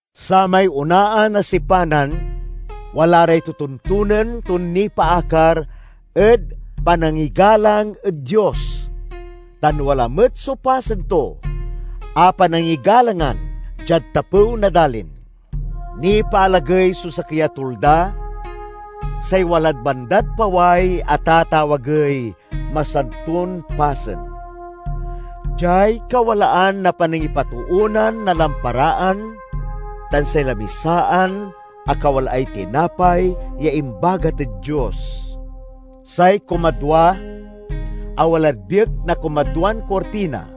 Samay onaan a sipanan wala ray totontonen ton nipaakar ed panangigalang ed Dios, tan wala met so pasen to a panangigalangan diad tapew na dalin. Nipaalagey so sakey a tulda, say walad bandad paway a tatawagey Masanton Pasen. Diay kawalaan na panangipatoonan na lamparaan tan say lamisaan a kawalaay tinapay ya imbagat ed Dios. Say kumadwa, a walad biek na kumadwan kurtina,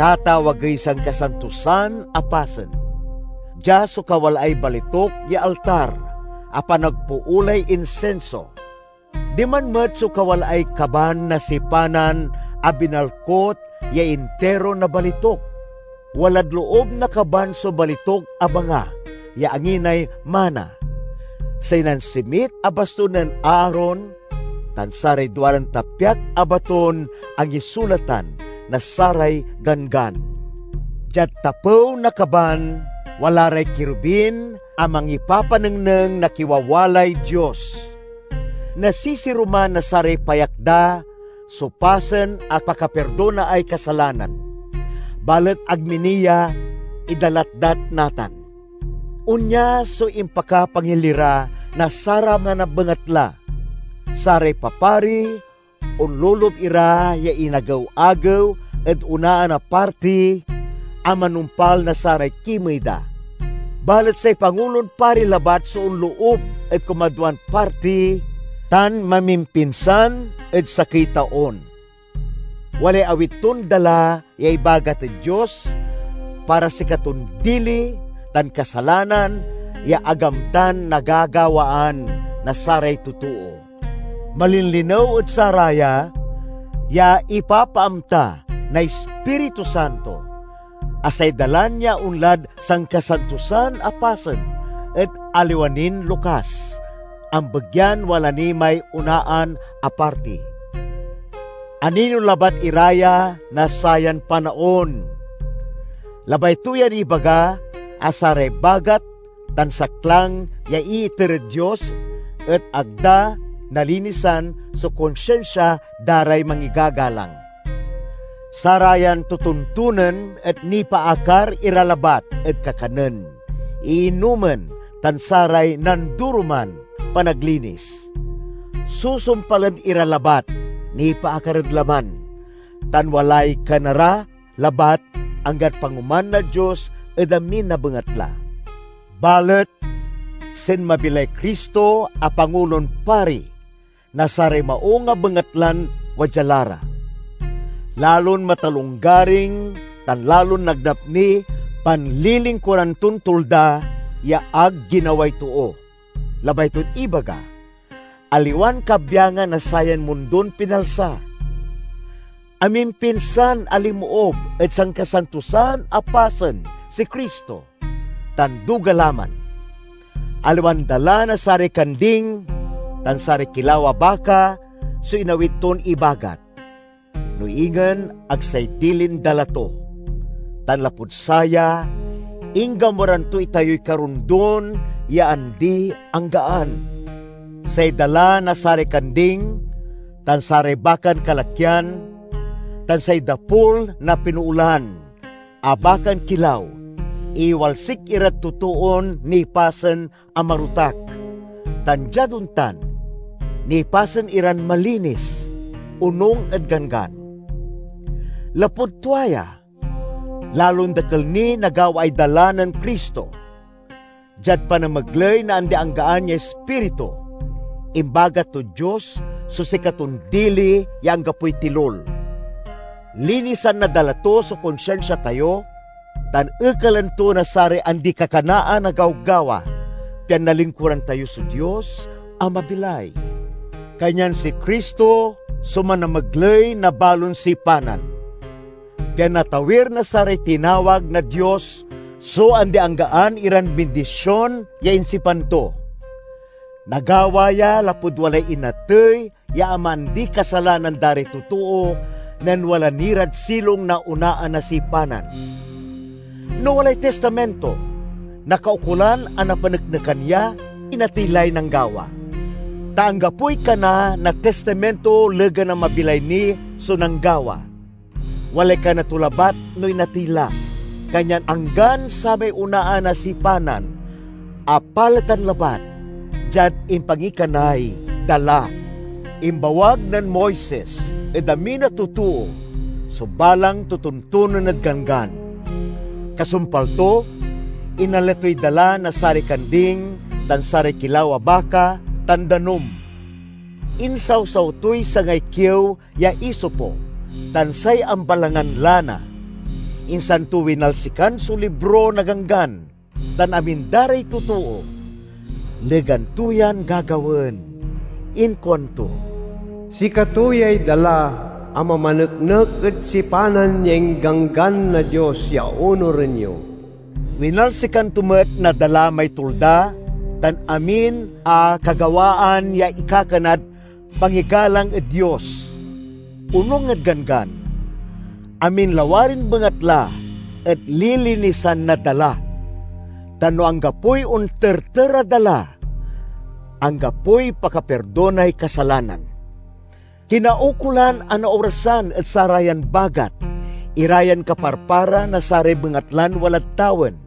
tatawagey Sankasantosan a Pasen. Dia so kawalaay balituk ya altar a panagpoolay insinso; diman met so kawalaay kaban na sipanan a binalkut ya intiro na balituk. Walad loob na kaban so balituk a banga ya anginay mana, say nansimit a bastun nen Aaron, tan saray duaran tapyak a baton angisulatan na saray ganggan. Diad tapew na kaban wala ray kirubin a mangipapanengneng na kiwawalay Dios. Nasisiruman na saray payak da so pasen a pakapirdonaay kasalanan. Balet ag mi ni ya idalatdat natan. Onya so impakapangilira na saraman a bengatla. Saray papari onloloob ira ya inagew-agew ed onaan a parti a manumpal na saray kimey da. Balet say Pangulon Pari labat so onloob ed kumadwan parti, tan mamimpinsan ed sakey taon. Walay awit ton dala ya ibagat ed Dios para sikaton dili tan kasalanan ya ag amtan nagagawaan na saray totoo. Malinlinew ed saraya ya ipapaamta na Ispiritu Santo a say dalan ya onlad Sankasantosan a Pasen et aliwa nin lokas, ambegyan wala ni may onaan a parti. Anino labat ira ya na sayan panaon. Labay to yan ibaga a saray bagat tan saklang ya iiter ed Dios et ag da nalinisan so konsinsia da ray mangigagalang. Sarayan totontonen et nipaakar ira labat ed kakanen, iinomen, tan saray nandoroman panaglinis. Susumpalen ira labat nipaakar ed laman, tan walay kana ra labat anggad pangoman na Dios ed amin a bengatla. Balet sinmabi lay Cristo a Pangulon Pari na saray maung a bengatlan wadya la ra. Lalon matalonggaring tan lalon nagnap niy panlilingkuran ton tulda ya ag ginaway too, labay ton ibaga, aliwan kabyangan na sayan mundon pinalsa. Amimpinsan a linmoob ed Sankasantosan a Pasen si Cristo, tan duga la man. Aliwan dala na saray kanding tan saray kilaw a baka so inawit ton ibagat, no ingen ag say dilin dala to, tan lapud saya inggamuran to itayoy karondon ya andi-anggaan. Say dala na saray kanding tan saray bakan kalakyan tan say dapul na pinoolan a bakan kilaw iwalsik irad totoon nipasen a marotak tan, diad ontan, nipasen iran malinis, onung ed ganggan. Lapud tua ya, lalon dakel niy nagawaay dala nen Cristo! Diad panamegley na andi-anggaan ya Ispiritu, imbagat tod Dios so sikaton dili ya anggapoy tilul. Linisan na dala to so konsinsia tayo tan ekalan to na saray andi-kakanaan a gawgawa, pian nalingkuran tayo so Dios a mabilay. Kanyan si Cristo so manamegley na balon sipanan, pian natawir na saray tinawag na Dios so andi-anggaan iran bindision ya insipan to. Nagawa ya lapud walay inatey ya amaandiy kasalanan da ray totoo nen wala ni rad silong na onaan a sipanan. No walay tistaminto, nakaukolan a napaneknekan ya inatey lay nanggawa. Ta anggapoy kana na tistaminto legan a mabilay ni so nanggawa; walay kana to labat no inatey la. Kanyan anggan samay onaan a sipanan apaletan labat diad impangikanay dala. Imbawag nen Moises ed amin a totoo so balang totontonen ed Ganggan. Kasumpal to, inala toy dala na saray kanding tan saray kilaw a baka, tan danum. Insawsaw toy sangay kiew ya isopo tan say ambalangan lana, insan to winalsikan so libro na Ganggan tan amin da ray totoo. Legan to yan gagawaen inkuanto, "Sikato yay dala a mamaneknek ed sipanan ya ingganggan na Dios ya onuren yo." Winalsikan to met na dala may tulda tan amin a kagawaan ya ikakanad pangigalang ed Dios. Onung ed Ganggan, amin lawarin bengatla et lilinisan na dala; tan no anggapoy onterter a dala, anggapoy pakapirdonay kasalanan. Kinaukolan a naorasan ed sarayan bagat ira yan kaparpara na saray bengatlan walad tawen,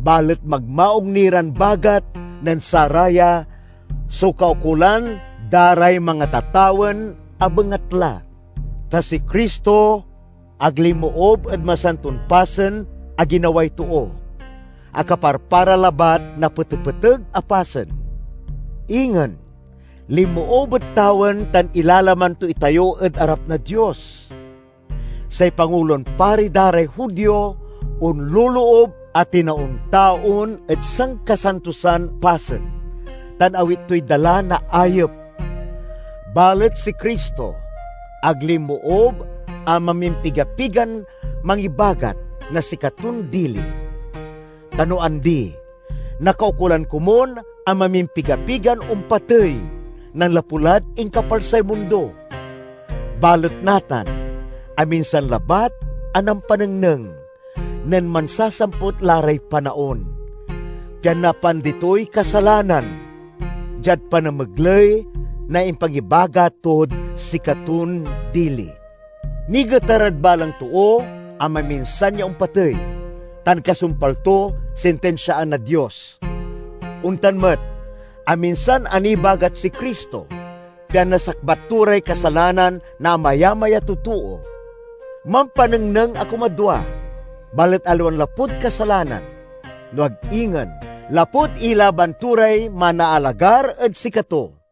balet magmaung ni ran bagat nen saraya so kaukolan da ray mangatatawen a bengatla. Ta si Cristo ag linmoob ed masanton pasen a ginaway too, a kaparpara labat na petepeteg a pasen. Ingen, linmoob ed tawen tan ilalaman to itayo ed arap na Dios. Say Pangulon Pari da ray Judio onloloob a tinaon-taon ed Sankasantosan Pasen, tan awit toy dala na ayep. Balet si Cristo ag linmoob a mamimpiga-pigan mangibagat na sikaton dili. Ta no andi, nakaukolan komun a mamimpigapigan ompatey nanlapu lad inkapalsay mundo. Balet natan aminsan labat a nampanengneng, nen mansasamput la ray panaon, pian napaandi toy kasalanan, diad panamegley na impangibagat tod sikaton dili. Nigetar ed balang too a maminsan ya ompatey, tan kasumpal to sintinsiaan na Dios. Ontan met, aminsan a nibagat si Cristo, pian nasakbat to ray kasalanan na amayamay a totoo. Mampanengneng a kumadwa, balet aliwan lapud kasalanan, no ag ingen lapud ilaban to ray manaalagar ed sikato.